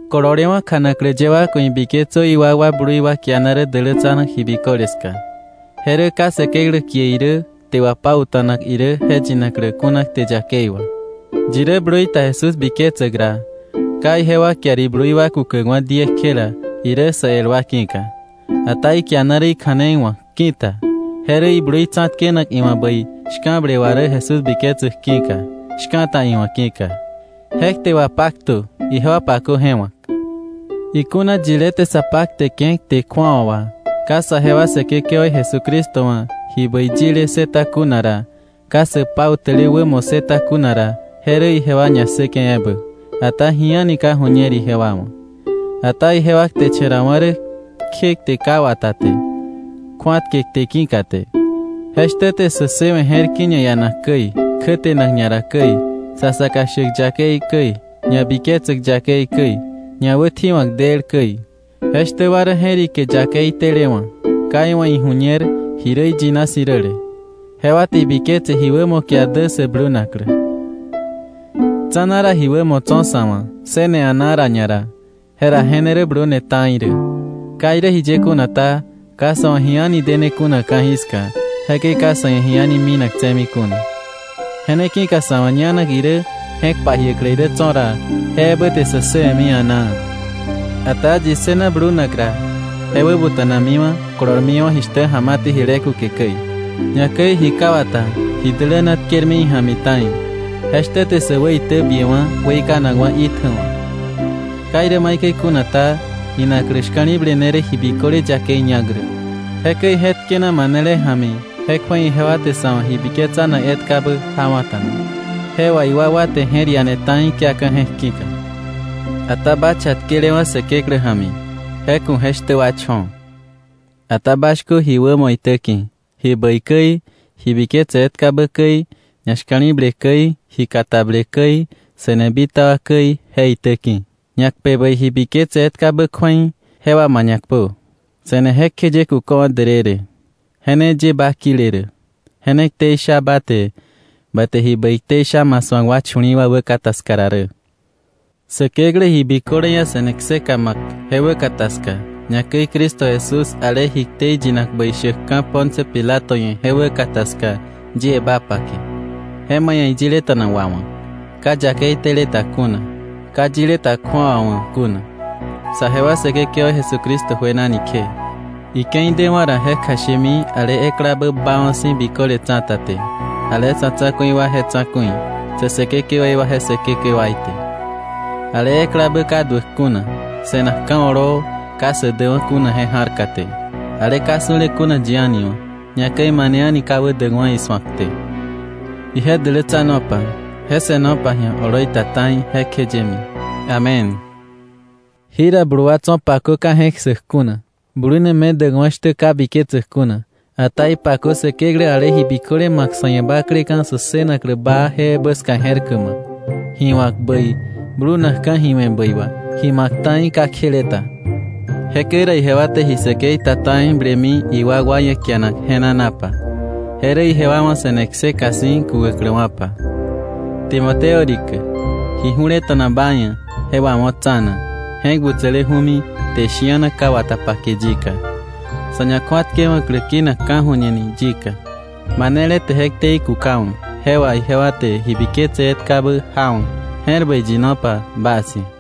Kololewa̱ kjanaklä ye wa ku̱ ibiketsö iwakwa blui wa kiana rä dälätsanak ji biköle ska. Je rä ka Säkeklä kie irä kte wapauta̱nak irä je yinaklä kuna kte yakei wà. Yi rä blui ta Jesús biketsäk ra, ka ijewa kiar iblui wa kukäkwa̱ diekjela irä sä el wa ki̱ka. Ata ikiana rä ikja̱nei wa̱k ki̱ta, je rä iblui tsa̱tkenak iwa̱ bäi shka̱ble wà rä Jesús biketsäk ki̱ka, shka̱ta iwa̱ ki̱ka. Je kte wapaktö; ijewa pakö je wa̱k. Ikuna yilé te sa pakteke̱ kte kju̱awa wà, ka saje wa Säkekewaí Jesucristo wa̱ ji bäi yile ssëta kuna ra, ka sä pautäle wämo ssëta kuna ra, je rä ijewa ñassäke̱ ebä, ata ji a̱ni ka ju̱ñer ijewa wa̱. Ata ijewa kteche̱rawa̱ rä kje kte ka wata te, kju̱atke kte ki̱ka te. Je shtä te sä ssëwe̱ je̱r ki̱ ñaianak käi, kjätenak ñara käi, sa saka shäk yakei käi, ñabiketsäk yakei käi, ñawätji̱wa̱k del käi. Je shtä wa rä je̱rike yakei telewa̱, ka iwa̱ iju̱ñer ji rä iyina si̱ räle. Jewa te ibiketse ji wämo kiar dä sä blunaklä. Tsa̱na ra ji wämo tso̱ sa̱ wa̱ ssëne a̱naa ra ñara, jera je ne rä blune ta̱i rä. Ka irä jiye kuna ta, ka sa̱ wa̱ ji a̱ni dene kuna ka̱jiska. Jekäi ka sa̱ ia̱ ji a̱ni minak tse̱mi kuna. Je ne ki̱ka sa̱ wa̱ ñanak irä je̱k pajiäklä irä tso̱ ra, je ebä te sä ssëwe̱mi a̱naa. Ata yi ssëna blunak ra, je wäbuta̱namiwa̱, kolormiwa̱ jishtä ja̱ma te jile kuke käi, ñakäi ji ka wata ji däläna tkermi ija̱mi ta̱i; je shtä te sä wäitäbiewa̱ weikanakwa̱ itjäwa̱. Ka irä maikäi kuna ta, inaklä shka̱li̱ble ne rä ji biköle yakei ñak rä. Jekäi je tkena manele ja̱mi, je kju̱ei ijewa te sa̱ wa̱ ji biketsanak etkabä jawa̱ta̱na. Je wà iwakwa te je̱r ia̱ne ta̱i kiaka̱ je̱k ki̱ka. Ata ba chatkelewa̱ Säkeklä ja̱mi, je ku̱ je shtä wa cho̱. Ata ba shkö ji wämo itä ki̱, ji bäi käi, ji biketse etkabä käi, ñashka̱li̱ble käi, ji katable käi, se̱ne bitaba käi, je itä ki̱. Ñakpe bäi ji biketse etkabä kju̱ei, je wà ma ñakpö. Se̱ne jekjeye kuköwa̱ därërë. Je ne ye ba kile rä, je ne ktei sha ba te, ba te ji bäi ktei sha ma su̱ak chu̱li̱i̱ wa wäkata ska ra rä. Säkeklä ji biköle ia̱ se̱ne kseka ma̱k je wäkata ska, ñakäi Cristo Jesús ale ji ktei yinak bäi shäkka̱ Poncio Pilato ia̱ je wäkata ska yie ba pake, je ma ia̱ iyileta̱na wawa̱k, ka yakei tele ta kuna, ka yile ta kju̱awa wa̱ kuna, sajewa Säkekewaí Jesucristo juenani kje. Ike̱i dewa̱ ra, je kjashemi ale eklabä baawa̱ si̱ biköle tsa̱ta te, ale sa̱ tsa̱ku̱i wa je Tsa̱ku̱i, sä säkekewaí wa je Säkekewaí te, ale eklabä ka duäk kuna, se̱nak ka̱ oloo ka sä däwa̱ kuna je ja̱rka te, ale ka su̱le kuna yi a̱ni wa̱, ñakäi mane a̱ni ka wä däkwa̱ isu̱ak te. Ije dälätsanopa, je se̱nopa ji̱a oloi ta ta̱i jekjeyemi. Amén. Jira blu wa tso̱ pakö ka je̱k ssäk kuna, blune medäkwa̱ shtä ka biketsäk kuna. Ata ipakö Säkeklä ale ji biköle ma̱k sa̱ ia̱ bakleka̱ sä ssënaklä baa je ja̱mi je̱r bläk, ji wa̱k bäi, blunakka̱ ji we̱ bäi wà, ji ma̱k ta̱i ka kjele ta. Jekäi ra ijewa te ji säkei ta ta̱i blemi iwakwa ia̱ kianak je̱nanapa. Je rä ijewa wa̱ se̱ne kseka si̱ kukäkläwa̱pa. Timoteo rikä, ji ju̱leta̱na ba ia̱ je wawo̱ tsa̱na, je̱k butsäleju̱mi kte shi̱ana ka wata pake yika, sa̱ ñakju̱atkewa̱klä kinak ka̱ju̱ñe ni yika. Manele te je ktei kukawa̱, je wà ijewa te ji biketse etkabä jawa̱. Je̱r bäi yinopa bas ia̱.